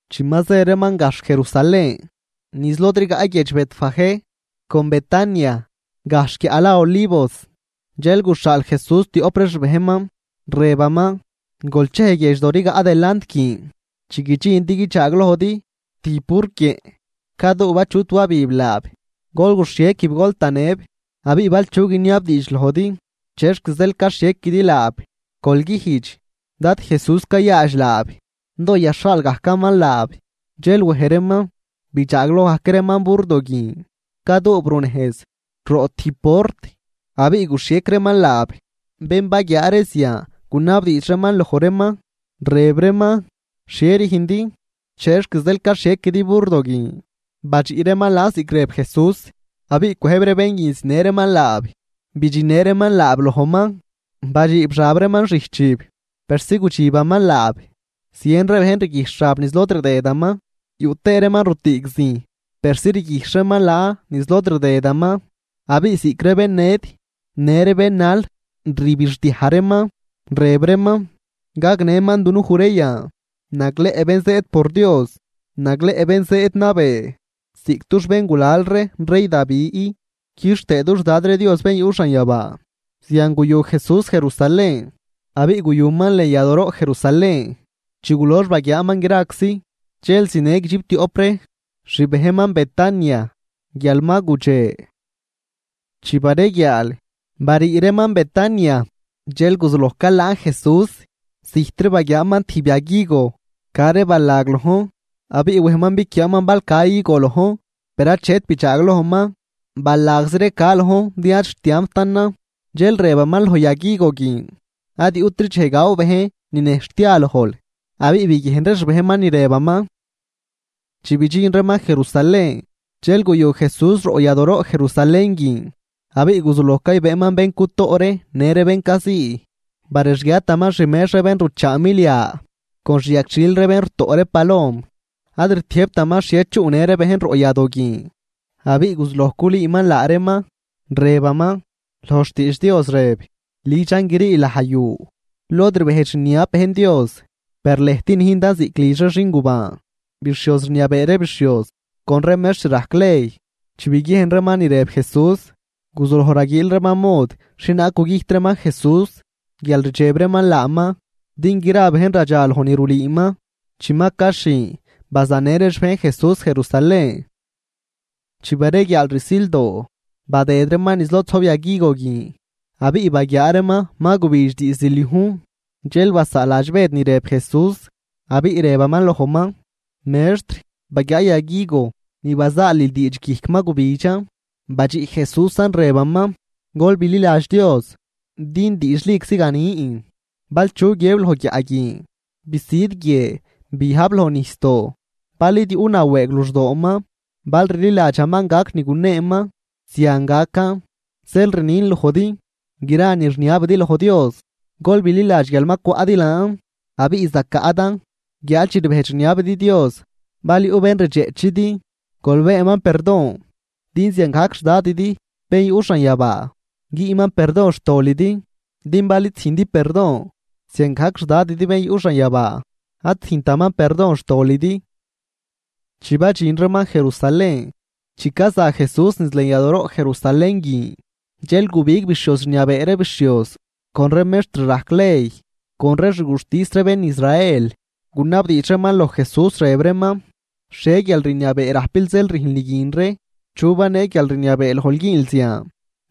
Chi ma zë reeman gajxh Jerusalén, niz lod rigaꞌ guiedx Betfagé con Betania, gajxh guiaꞌ la Olivos, dxel guxhaal Jesús tioꞌp ree xbejnman, rëbaman: ―Gol chej guiedxdo rigaꞌ delant guin. Chi guidxindi guidxaaglojdi tijb burquieꞌn, caduub achut wabib laab. Gol guxhiequib gol tanëb. Abiꞌ bal chu guiniabdiidx lojdi: “Chexc zeel caxhiequidi laab”, gol güjdx: “Dad Jesús cayaadx laab, doo yaxhaal gajcaman laab.” Dxel wej reeman, bidxaagloj gajc reeman burdo guin, caduub runejz roꞌ tijb port, abiꞌ guxhiec reeman laab. Bén baguiaa ree zian gunabdiidx reeman loj reeman, rëb reeman: ―¿Xhie rüjndi? ¿Chexc zeel caxhiequidi burdo guin? Badxiꞌ reeman laan ziꞌc rëb Jesús, abiꞌ cwëjb ree bén guin zinë reeman laab. Bidxinnë reeman laab lojman, badxiib xab reeman xijchib, persi gudxibaman laab. Zien ree bejn riguijxh xab niz lod rdëdaman, yuꞌ tëë reeman rutüüg zijn persi rguijxh reeman laan niz lod rdëdaman. Abiꞌ ziꞌc ree bén ned, në ree bén nal rbixdiaj reeman, rëb reeman: ―¡Gagnëman dunuj ree yan! ¡Nagleꞌ bén zëëd por Dios! ¡Nagleꞌ bén zëëd nabee ziꞌc dux béngulal ree rey Davi! ¡Quixtëë dux Dad ree Dios Bén yuꞌ xanyabaa! Zian guyu Jesús Jerusalén abiꞌ guyuman lën yadooroꞌ Jerusalén. Chi gulox baguiaaman graczi, dxel zinë guidxiptioꞌp ree xbejnman Betania guial ma gudxe. Chi bareguiaal, barii reeman Betania. Dxel guzuloj calaan Jesús. Zijtri baguiaaman tijb yag higo ca ree balag lojn. Abiꞌ wejman biquiaaman bal ca higo lojn. Per achet bidxaaglojman, balagzi ree ca lojn din ad xtiamptanan. Dxel rëbaman loj yag higo guin: ―¡Ad yuꞌtri dxej gaw bejn ninejxh tia lojl! Abiꞌ biguiejn ree xbejnman ni rëbaman. Chi bidxin reeman Jerusalén. Dxel guyu Jesús roꞌ yadooroꞌ Jerusalén guin, abiꞌ guzuloj caybëëman bén cutoꞌ ree në ree bén cazii. Barexguiataman xmex ree bén ruchaa milia con xyagxhil ree bén rutoꞌ ree palom, ad rtiëjbtaman xhie chuꞌnë ree bejn roꞌ yadoo guin. Abiꞌ guzuloj culüüman laa reeman, rëbaman: ―Loj xtiidx Dios rëb: “Lidxan grii laj yu lod rbejdx rniab bejn Dios.” Per lëjt nüjndan ziꞌc lidx ree xingubaan. Bixhioz rniabee ree bixhioz con ree mextr rajc ley, chi biguiejn reeman ni rëb Jesús, guzuloj raguiil reeman mod xhienaag gugüjt reeman Jesús, guial rdxeb reeman laaman din gra bejn radxaloj ni rulüüman. Chi ma caxhin, bazanë ree xbejn Jesús Jerusalén. Chi bareguiaal rsildoo, badëd reeman niz lod zojb yag higo guin, abiꞌ baguiaa reeman ma gubidx diizd liujn. Dxel basaaladx Bëd ni rëb Jesús, abiꞌ rëbaman lojman: ―Mextr, ¡baguiaa yag higo ni bazaalil diidx guijc ma gubidxan! Badxiꞌ Jesúsan rëbaman: ―Gol bililadx Dios. Din diidxliczi ganin, bal chu guiëb loj guiaꞌ guin: “Bisüd guie biajb loj nijsdoo”, bal id yuꞌ nawëëg luxdooman, bal rliladxaman, gac ni guneeman. Zian gacan. Zeel rnin lojdi, gra ni rniabidi loj Dios, gol bililadx guial ma cwaꞌdi laan, abiꞌ zacaꞌdan. Guiáad chi ribejdx rniabidi Dios, bal yuꞌ bén rdxeꞌchidi, gol beenman perdon din ziangajc xDadidi bén yuꞌ xanyabaa güünman perdon xtolidi. Din bal id züjndi perdon, ziangajc xDadidi Bén yuꞌ xanyabaa ad züjntaman perdon xtolidi. Chi badxin reeman Jerusalén. Chi caza Jesús niz lën yadooroꞌ Jerusalén guin, dxel gubig bixhioz rniabee ree bixhioz con ree mextr rajc ley con ree xguxtis ree bén Israel, gunabdiidx reeman loj Jesús, rëb reeman: ―¿Xhie guialrniabee rajpil zeel rüjnl ni guin ree? ¿Chu banee guialrniabee lojl güünl zian?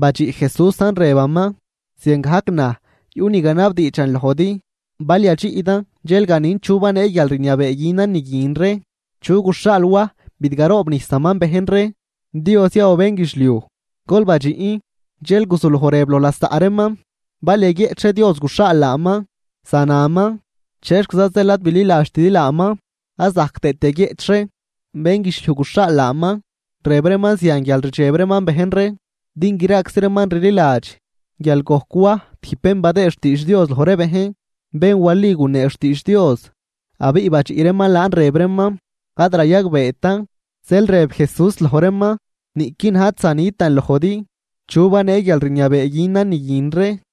Badxiꞌ Jesúsan rëbaman: ―Ziangajc naj yuꞌ ni ganabdiidxan lojdi, bal yadxiꞌdan dxel ganin chu banee guialrniabee günan ni guin ree. ¿Chu guxhaal Waj bidgaroobnijsaman bejn ree? ¿Dios ya o bénguidxliuj? Gol badxiꞌn. Dxel guzuloj rëb loj lasaꞌ reeman: ―Bal yaguieꞌch ree, Dios guxhaal laaman, zanaman: “¿Chexquiza zeel ad bililadxtidi laaman?” Ad zajc tëët yaguieꞌch ree, bénguidxliuj guxhaal laaman. Rëb reeman zian guial rdxeb reeman bejn ree, din graczi reeman rliladx guial gojc Waj tijb bén badëë xtiidx Dios loj ree bejn, bén wali gunee xtiidx Dios. Abiꞌ badxiꞌ reeman laan rëb reeman: ―Ad rayagbeetan. Zeel rëb Jesús loj reeman: ―Niꞌqui naj ad zanitan lojdi chu banee guialrniabee günan ni guin ree.